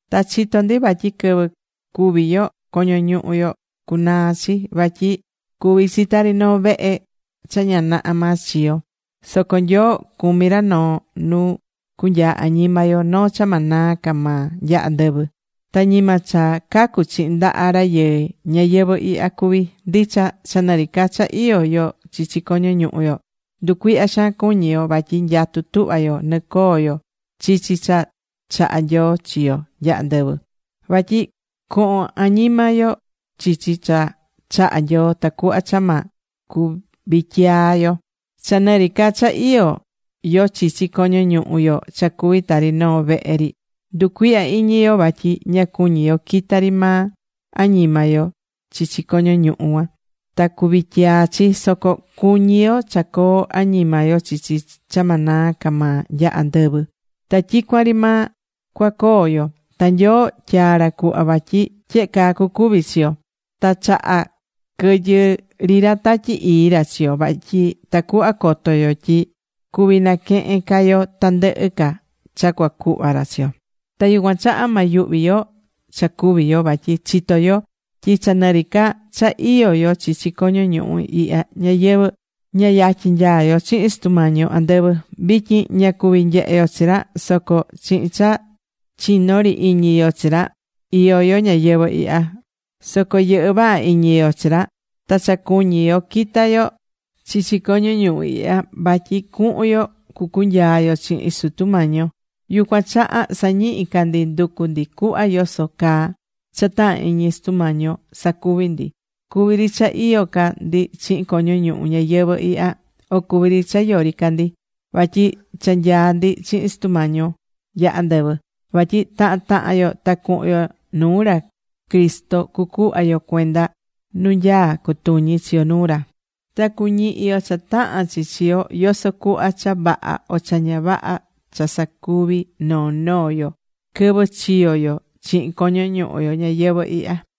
Ta chitó ndi vatyi quɨvɨ cúvi yo, coño ñuhu yo cunaa chi. Vatyi cuví chi tari noo vehe cha ña naha maa chiyo̱. Soco Nyoo cumí ra noo nu cunyaa añima yo, noo cha ma naa ca maa nya andɨvɨ. Ta ñima cha cacu̱ chihin ndaha rayɨɨ ñayɨvɨ̱ ihya cuví. Ndicha, cha nɨ ri ca cha iyó yo chichi coño ñuhu yo, nducuihyá xaan cuñí yo, vatyi nyatú tuhva yo nɨcoo yo chichi cha chahá Nyoo chi yo nya andɨvɨ. Vatyi cohon añima yo chichi cha chahá Nyoo tacuhva cha ma cuvityiyaá yo. Cha nɨ ri ca cha iyó yo chichi coño ñuhu yo cha cuví tari noo vehe ri, nducuihyá iñi yo vatyi ña cuñí yo quita ri maa añima yo chichi coño ñuhu cuan ta cuvityiyaá chi. Soco cuñí yo cha coo añima yo chichi cha ma naa ca maa nya andɨvɨ ta tyicuan ri maa cuacoo yo. Ta Nyoo tyaa̱ ra cuhva vatyi tyehe caa cucuvi chi yo. Ta chahá quɨyɨ ri ra Tatyi Ii ra chi yo. Vatyi tacuhva coto yo tyi cuví naquehen ca yo tandɨhɨ ca cha cuacuhva ra chi yo. Ta yucuan chaha ma yuhvi yo cha cúvi yo. Vatyi chitó yo tyi cha nɨ ri ca cha iyó yo chichi coño ñuhu ihya ñayɨvɨ̱, ña yatyin nyaá yo chihin Sutu Mañi yo andɨvɨ. Vityin ña cuví nyehe yo chi ra, soco chihin cha chiñó ri iñi yo chi ra, iyó yo ñayɨvɨ̱ ihya. Soco yɨhɨ́ vaha iñi yo chi ra ta cha cuñí yo quita yo chichi coño ñuhu ihya vatyi cuhun yo cucunyaa yo chihin Sutu Mañi yo. Yucuan chaha sañihi ca ndi nducú ndi cuhva yoso caa cha tahan iñi Sutu Mañi yo sacuví ndi. Cuví ri cha iyó ca ndi chihin coño ñuhu ñayɨvɨ̱ ihya. O cuví ri cha yori ca ndi, vatyi cha nyaá ndi chihin Sutu Mañi yo nya andɨvɨ. Vatyi tahan tahan yo ta cuhun yo nuu ra Cristo cucuhva yo cuenda nu nyaá cutuñi chi yo nuu ra. Ta cuñihi yo cha tahán chi chi yo, yoso cuhva cha vaha o cha ña vaha cha sacuvi̱ noo noo yo quɨvɨ chiyo̱ yo chihin coño ñuhu yo ñayɨvɨ̱ ihya.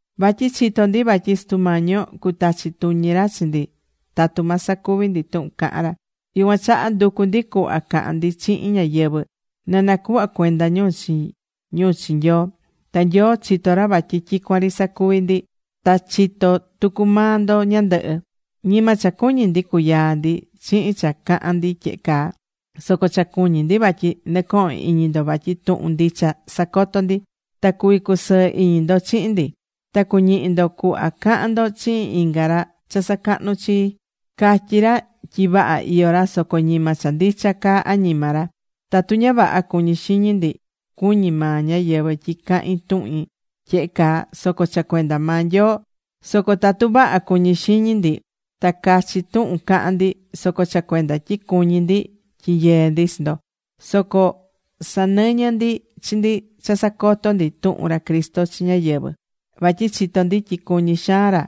Vatyi chitó ndi vatyi Sutu Mañi yo cutachi tuñi ra chi ndi tatu ma sacuvi ndi tuhun cahán ra. Yucuan chaha nducú ndi cuhva cahán ndi chihin ñáyɨvɨ na nacuhva cuenda ñu chi ñu chi Nyoo. Ta Nyoo chitó ra vatyi tyicuan ri sacuví ndi. Ta chitó tucu maa ndo ñandɨhɨ. Ñima cha cuñí ndi cuyaa ndi chihin cha cahán ndi tyehe caa, soco cha cuñí ndi vatyi nɨcohón iñi ndo vatyi tuhun ndicha sacotó ndi, ta cuví cusɨɨ iñi ndo chihin ndi. Ta cuñihí ndo cuhva cahán ndo chihin inga ra cha sacahnú chii. Catyí ra tyi vaha iyó ra, soco ñima cha ndicha caa añima ra. Tatu ña vaha cuñí xiñi ndi, cuñí maa ñáyɨvɨ tyi cahín tuhin tyehe caa, soco cha cuenda maa Nyoo. Soco tatu vaha cuñí xiñi ndi, ta cachi tuhun cahán ndi, soco cha cuenda tyi cuñí ndi tyinyeé ndi chi ndo. Soco sanɨñɨ́ ndi chi ndi cha sacotó ndi tuhun ra Cristo chi ñáyɨvɨ. Vatyi chitó ndi tyi cuñí xaan ra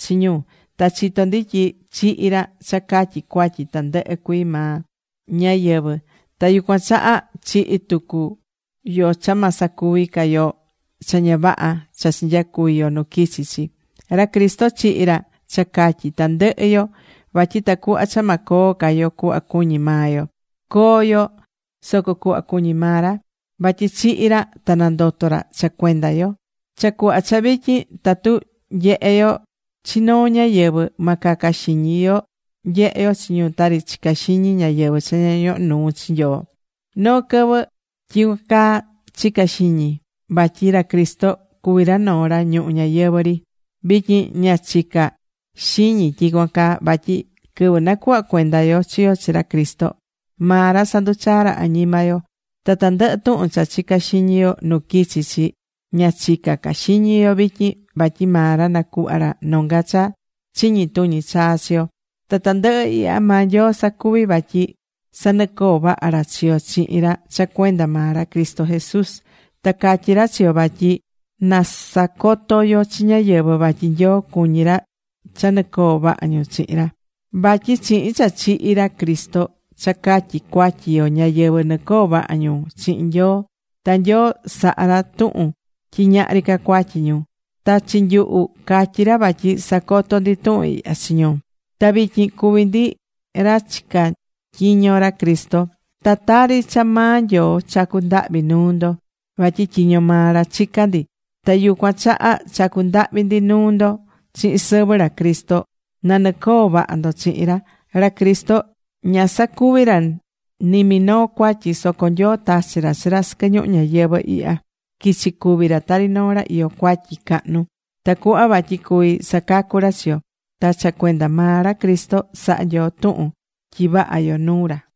chi ñu. Ta chitó ndi tyi chihi̱ ra cha catyi cuatyi tandɨhɨ cuii maa ñáyɨvɨ. Ta yucuan chaha chihi tucu yo cha ma sacuvi ca yo cha ña vaha cha chinyacuvi̱ yo nu quichi̱ chi. Ra Cristo chihi̱ ra cha catyi tandɨhɨ yo vatyi tacuhva cha ma coo ca yo cuhva cuñí maa yo. Co̱o yo soco cuhva cuñí maa ra. Vatyi chihi̱ ra ta nandoto̱ ra cha cuenda yo. Cha cuhva cha vityin, tatu nyehé yo chi noo ñáyɨvɨ, ma caca xiñi yo nyehe yo chi ñu tari chicá xiñi ñáyɨvɨ cha ña ñohó nuu chi Nyoo. Noo quɨvɨ tyicuan caa chica̱ xiñi vatyi ra Cristo cuví ra noo ra ñuhu ñayɨvɨ̱ ri. Vityin ña chicá ca xiñi tyicuan caa. Vatyi quɨvɨ nacuhva̱ cuenda yo chi yo chi ra Cristo, maa ra sanduchaa̱ ra añima yo. Ta tandɨhɨ tuhun cha chica̱ xiñi yo nu quichi̱ chi, ña chicá ca xiñi yo vityin. Vatyi maa ra nacuhva̱ ra nonga cha chiñi tuñi chaa chi yo. Ta tandɨhɨ ihya maa Nyoo sacuvi̱, vatyi sanɨcoo vaha ra chi yo chihin ra cha cuenda maa ra Cristo Jesús. Ta catyí ra chi yo vatyi na sacoto yo chi ñáyɨvɨ vatyi Nyoo cuñí ra cha nɨcoo vaha ñu chihin ra. Vatyi chihin cha chihi̱ ra Cristo cha catyi cuatyi yo, ñáyɨvɨ nɨcoó vaha ñu chihin Nyoo. Ta Nyoo sahá ra tuhun tyi ñahri ca cuatyi ñu. Ta chi nyuhu, catyí ra vatyi sacotó ndi tuhun ihya chi ñu. Ta vityin cuví ndi ra chicá tyiño ra Cristo. Ta tari cha maa Nyoo chacú ndahvi nuu ndo, vatyi tyiño maa ra chicá ndi. Ta yucuan chaha chacú ndahvi ndi nuu ndo chihin sɨvɨ ra Cristo, na nɨcoo vaha ndo chihin ra. Ra Cristo ña sacuvi̱ ra ni minoo cuatyi. Soco Nyoo tachi̱ ra chi ra sɨquɨ ñuhu ñayɨvɨ̱ ihya, quichi̱ cúvi ra tari noo ra iyó cuatyi cahnu. Tacuhva vatyi cuví sacacu ra chi yo. Ta cha cuenda maa ra Cristo saha̱ Nyoo tuhun tyi vaha yo nuu ra.